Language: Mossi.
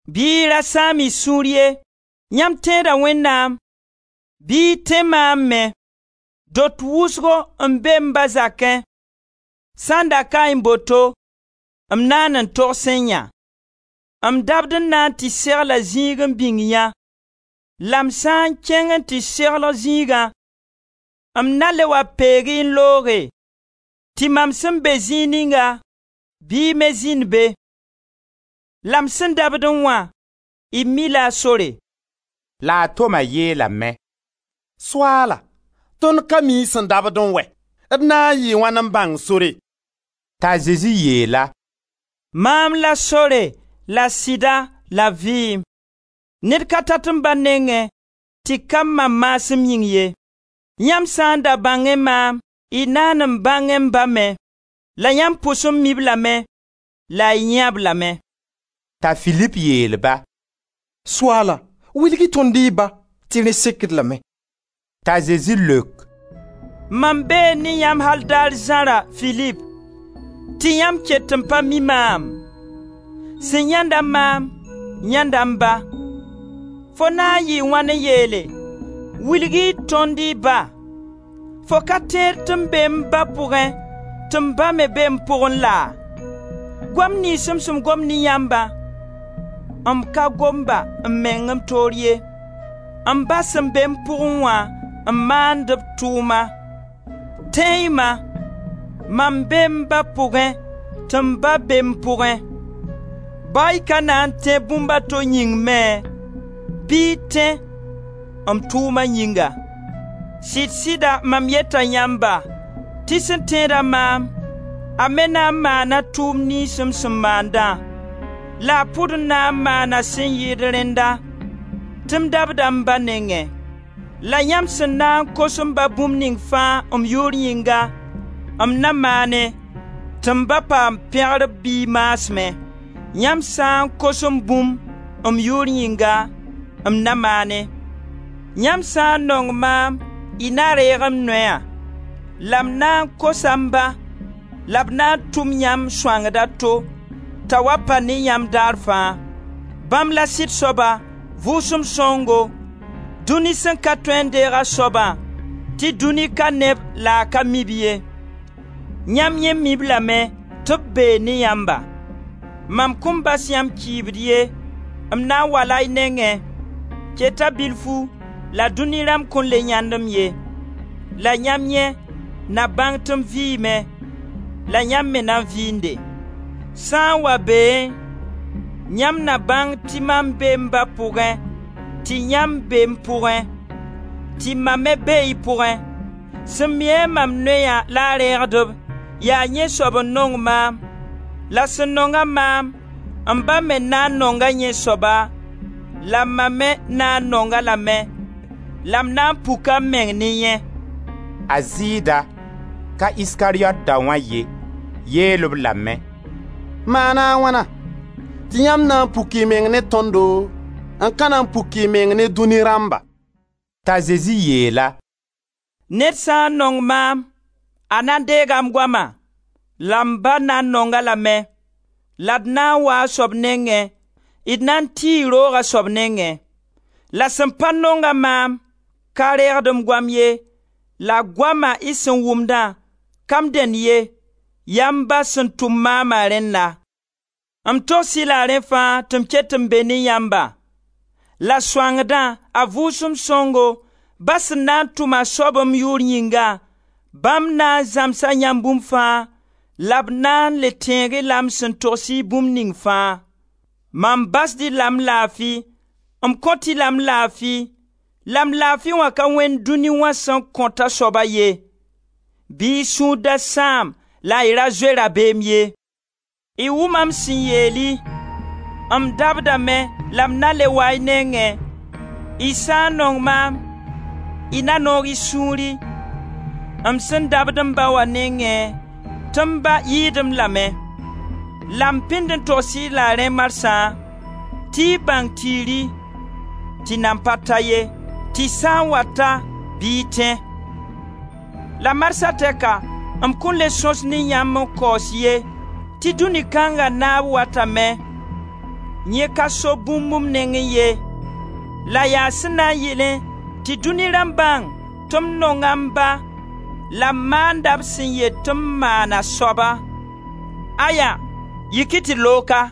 Bɩ y ra sãam-y sũur ye! Yãmb tẽeda Wẽnnaam, bɩ y tẽ maam me. Dot wʋsgo n be m Ba zakẽ, sã n da kaẽ boto m naan n togsẽ yã; m dabd n na tɩ segla zĩig n bĩng yã. La m sã n kẽng n tɩ segl zĩigã, m na le wa peeg-y n looge, tɩ mam sẽn be zĩig ninga bɩ y me zĩnd be. La m sẽn dabdẽ wã, y mi-la a sore.» La a Toma yeelame: «Soaala, tõnd ka mi y sẽn dabdẽ wɛ! D na n yɩɩ wãn n bãng sore?» T'a Zezi yeel-a: «Maam la sore, la sɩda, la vɩɩm. Ned ka tat m Ba nengẽ tɩ ka mam maasem yĩng ye. Yãmb sã n da bãngẽ maam, y naan n bãngẽ m Ba me, la yãmb pʋs n mi-b lame, la y yãee-b lame.» T'a Filip yeel-ba: «Soaala, wilg-y tõnd y Ba tɩ rẽ sekd-d lame.» T'a Zezi leok: «Mam bee ne yãmb al daar zãra, Filip, tɩ yãmb ket n pa mi maam? Sẽn yãenda maam, yãenda m Ba. Fo na n yɩɩ wãn n yeele: ‹Wilg-y tõnd y Ba?› Fo ka tẽed tɩ m bee m Ba pʋgẽ tɩ m Ba me be m pʋgẽ laa? Goam niyns m sẽn gom ne yãmba, m ka gom-ba m meng m toor ye. M ba sẽn be m pʋgẽ wã, n maand b tʋʋma. Tẽe-y-ma! Mam bee m Ba pʋgẽ tɩ m Ba be m pʋgẽ. Ba y ka na n tẽ bũmb a to yĩng me bɩ y tẽ m tʋʋma yĩnga. Sɩd-sɩda mam yeta yãmba tɩ sẽn tẽed-a maam, a me na n maana tʋʋm niyns m sẽn maandã, la a pʋd n na maana sẽn yɩɩd rẽnna tɩ m dabda m Ba nengẽ. La yãmb sẽn na n kos m Ba bũmb ning fãa m yʋʋr yĩnga, m na maane, tɩ m Ba paam pẽgr b Biig maasmẽ. Yãmb sã n kos-m bũmb m yʋʋr yĩnga, m na maane. Yãmb sã n nong maam y na reeg m noya. La m na n kosa m Ba, la b na tʋm yãmb Sõangd a to t'a wa pa ne yãmb daar fãa. Bãmb la sɩd soaba, Vʋʋsem Sõngo, dũni sẽn ka tõe n deeg a soabã, tɩ dũni ka ne-b la a ka mi-b ye. Yãmb yẽ mi-b lame tɩ b bee ne yãmba. Mam kõn bas yãmb kɩɩbd ye, m na n wala y nengẽ. Keta bilfu, la dũni rãmb kõn le yãend-m ye. La yãmb yẽ na bãng tɩ m vɩɩme, la yãmb me na vɩɩnde. Sã n wa beẽ, yãmb na bãng tɩ mam bee m Ba pʋgẽ tɩ yãmb bee m pʋgẽ, tɩ mam me bee y pʋgẽ. Sẽn mi-a mam noya la a reegd-b, yaa yẽ soab n nong maam, la sẽn nong-a maam, m Ba me na n nonga yẽ soaba, la mam me na n nong-a lame, la m na n puka m meng ne yẽ.» A Zɩɩda, (ka Iskariyot daoã ye,) yeel-b lame: «Maan a wãna tɩ yãmb na n puk y meng ne tõndo n ka na n puk y meng ne dũni rãmba?» T'a Zezi yeel-a: «Ned sã n nong maam, a na deega m goama, la m Ba na n nong-a lame la d na n waa a soab nengẽ, d na n tii roog a soab nengẽ. La sẽn pa nong-a maam ka reegd m goam ye, la goama y sẽn wʋmda ka m dẽnd ye, yaa m Ba sẽn tʋm maama rẽnna. M togs-y la rẽ fãa tɩ m ket n be ne yãmba. La Sõangdã, a Vʋʋsem Sõngo, Ba sẽn na n tʋm a soab m yʋʋr yĩnga, bãmb na n zãmsa yãmb bũmb fãa, la b na n le tẽeg-y la m sẽn togs-y bũmb ning fãa. Mam basd-y la m laafi, m kõt-y la m laafi la m laafi wã ka wẽnd dũni wã sẽn kõt a soaba ye. Bɩ y sũur da sãam la y ra zoe rabeem ye. Y wʋma m sẽn yeel-y: m dabdame la m na n le waa y nengẽ, y sã n nong maam, y na noog y sũuri, m sẽn dabd m Ba wã nengẽ tɩ m Ba yɩɩd m la me. La m pĩnd n togsd-y la rẽ marsã tɩ y bãng tiiri tɩ nan pa ta ye tɩ sã n wa ta bɩ y tẽ. La Marsã tɛka m kõn le sõs ne yãmb n kaoos ye tɩ dũni kãnga naab watame; yẽ ka so bũmb m nengẽ ye, la yaa sẽn na yɩlẽ tɩ dũni rãmb bãng tɩ m nonga m Ba la m maanda b sẽn yet tɩ m maan a soaba. Aya! Yik-y tɩ d loog ka!